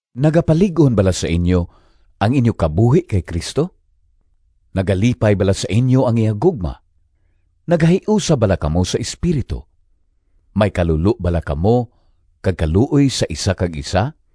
Nagapalig-on bala sa inyo ang inyo kabuhi kay Cristo? Nagalipay bala sa inyo ang iya gugma? Nagahiusa bala kamo sa Espiritu? May kalulo bala kamo kag kaluoy sa isa kag isa?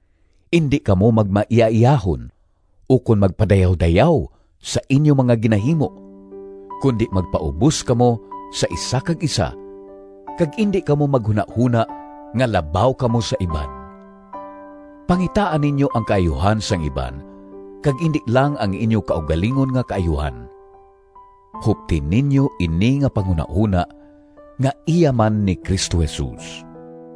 Indi kamo magmaiyaiyahon ukon magpadayawdayaw sa inyo mga ginahimo, kundi magpaubos kamo sa isa kag isa kag indi kamo maghunahona nga labaw kamo sa iban. Pangitaa ninyo ang kaayuhan sang iban kag indi lang ang inyo kaugalingon nga kaayuhan. Hupti ninyo ini nga panghunahona nga iya man ni Cristo Jesus: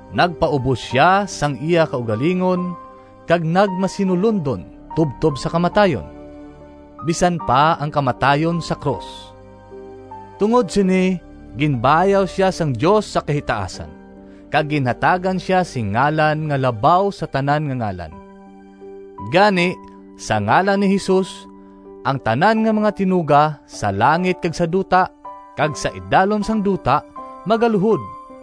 Nagpaubos siya sang iya kaugalingon Kag nagmasinulondon Tubtob sa kamatayon, Bisan pa ang kamatayon sa krus. Tungod sini Ginbayaw sia sang Dios sa kahitaasan, Kag ginhatagan sia sing ngalan Nga labaw sa tanan nga ngalan. Gani sa ngalan ni Jesus, Ang tanan nga mga tinuga, Sa langit kag sa duta, Kag sa idalom sang duta Magaluhod,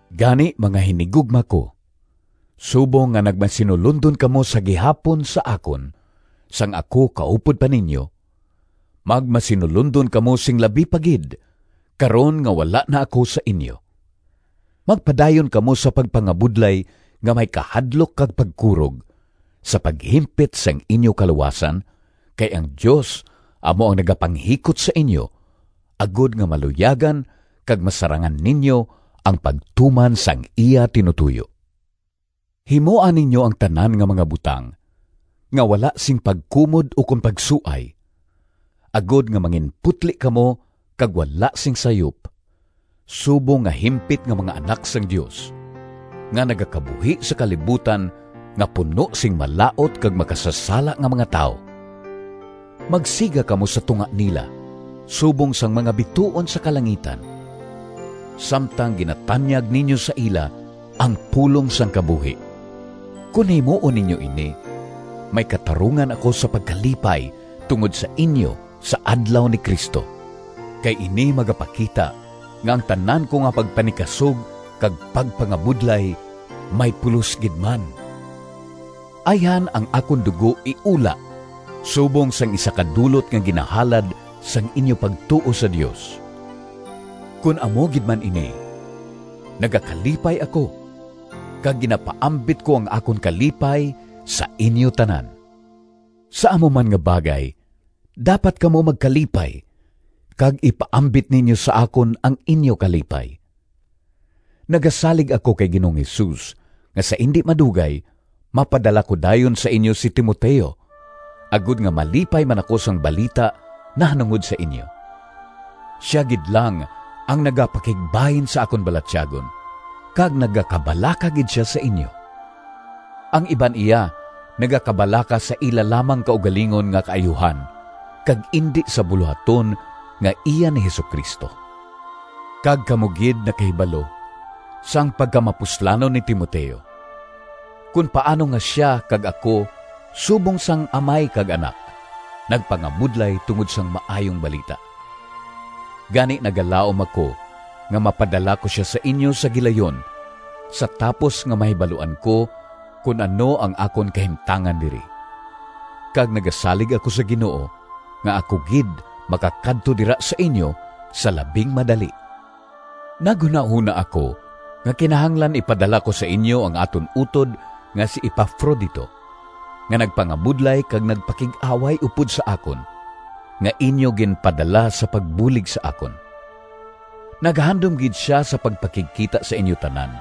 Gani, mga hinigugma ko, subong nga nagmasinulondon kamo sa gihapon sa akon sang ako kaupod pa ninyo, magmasinulondon kamo sing labi pa gid, karon nga wala na ako sa inyo. Magpadayon kamo sa pagpangabudlay nga may kahadlok kag pagkurog, sa paghimpit sang inyo kaluwasan, kay ang Dios amo ang nagapanghikot sa inyo, agod nga maluyagan kag masarangan ninyo ang pagtuman sang iya tinutoyo. Himoa ninyo ang tanan nga mga butang nga wala sing pagkumod ukon pagsuay, agod nga manginputli kamo kag wala sing sayop, subong nga himpit nga mga anak sang Dios, nga nagakabuhi sa kalibutan nga puno sing malaut kag makasasala nga mga tawo. Magsiga kamo sa tunga nila subong sang mga bituon sa kalangitan, samtang ginatanyag ninyo sa ila ang pulong sang kabuhi. Kon himuon ninyo ini, may katarungan ako sa pagkalipay tungod sa inyo sa Adlaw ni Cristo, kay ini magapakita nga ang tanan ko nga pagpanikasog kag pagpangabudlay may pulos gid man. Ayhan ang akon dugo iula subong sang isa ka dulot nga ginahalad sang inyo pagtuo sa Dios. Kon amo gid man ini, nagakalipay ako, kag ginapaambit ko ang akon kalipay sa inyo tanan. Sa amo man nga bagay dapat kamo magkalipay kag ipaambit ninyo sa akon ang inyo kalipay. Nagasalig ako kay Ginoong Jesus nga sa indi madugay mapadala ko dayon sa inyo si Timoteo, agod nga malipay man ako sang balita nahanungod sa inyo. Sia gid lang ang nagapakigbahin sa akon balatyagon, kag nagakabalaka gid sia sa inyo. Ang iban iya nagakabalaka sa ila lamang kaugalingon nga kaayuhan kag indi sa bulohaton nga iya ni Jesu-Cristo. Kag kamo gid nakahibalo sang pagkamapuslanon ni Timoteo, kon paano nga sia kag ako subong sang amay kag anak, nagpangabudlay tungod sang Maayong Balita. Gani nagalaom ako nga mapadala ko sia sa inyo sa gilayon sa tapos nga mahibaluan ko kon ano ang akon kahimtangan diri. Kag nagasalig ako sa Ginoo nga ako gid makakadto dira sa inyo sa labing madali. Naghunahona ako nga kinahanglan ipadala ko sa inyo ang aton utod nga si Epafrodito nga nagpangabudlay kag nagpakig-away upod sa akon, nga inyo ginpadala sa pagbulig sa akon. Nagahandom gid sia sa pagpakigkita sa inyo tanan,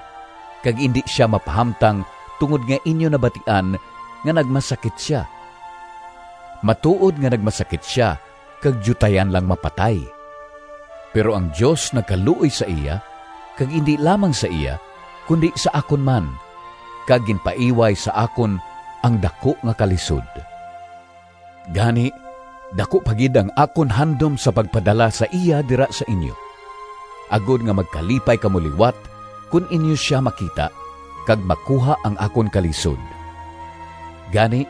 kag indi sia mapahamtang tungod nga inyo nabatian nga nagmasakit sia. Matuod nga nagmasakit sia kag diutayan lang mapatay, pero ang Dios nagkaluoy sa iya, kag indi lamang sa iya kundi sa akon man, kag ginpaiway sa akon ang daku nga kalisod. Gani daku pa gid ang akon handom sa pagpadala sa iya dira sa inyo, agod nga magkalipay kamo liwat kon inyo sia makita, kag makuha ang akon kalisod. Gani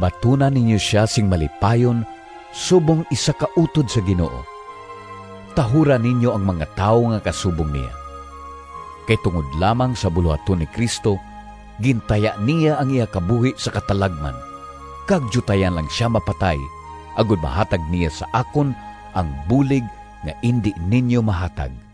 batuna ninyo sia sing malipayon subong isa ka utod sa Ginoo. Tahura ninyo ang mga tawo nga kasubong niya. Kay tungod lamang sa bulohaton ni Cristo gintaya niya ang iya kabuhi sa katalagman kag diutayan lang sia mapatay, agod mahatag niya sa akon ang bulig nga indi ninyo mahatag.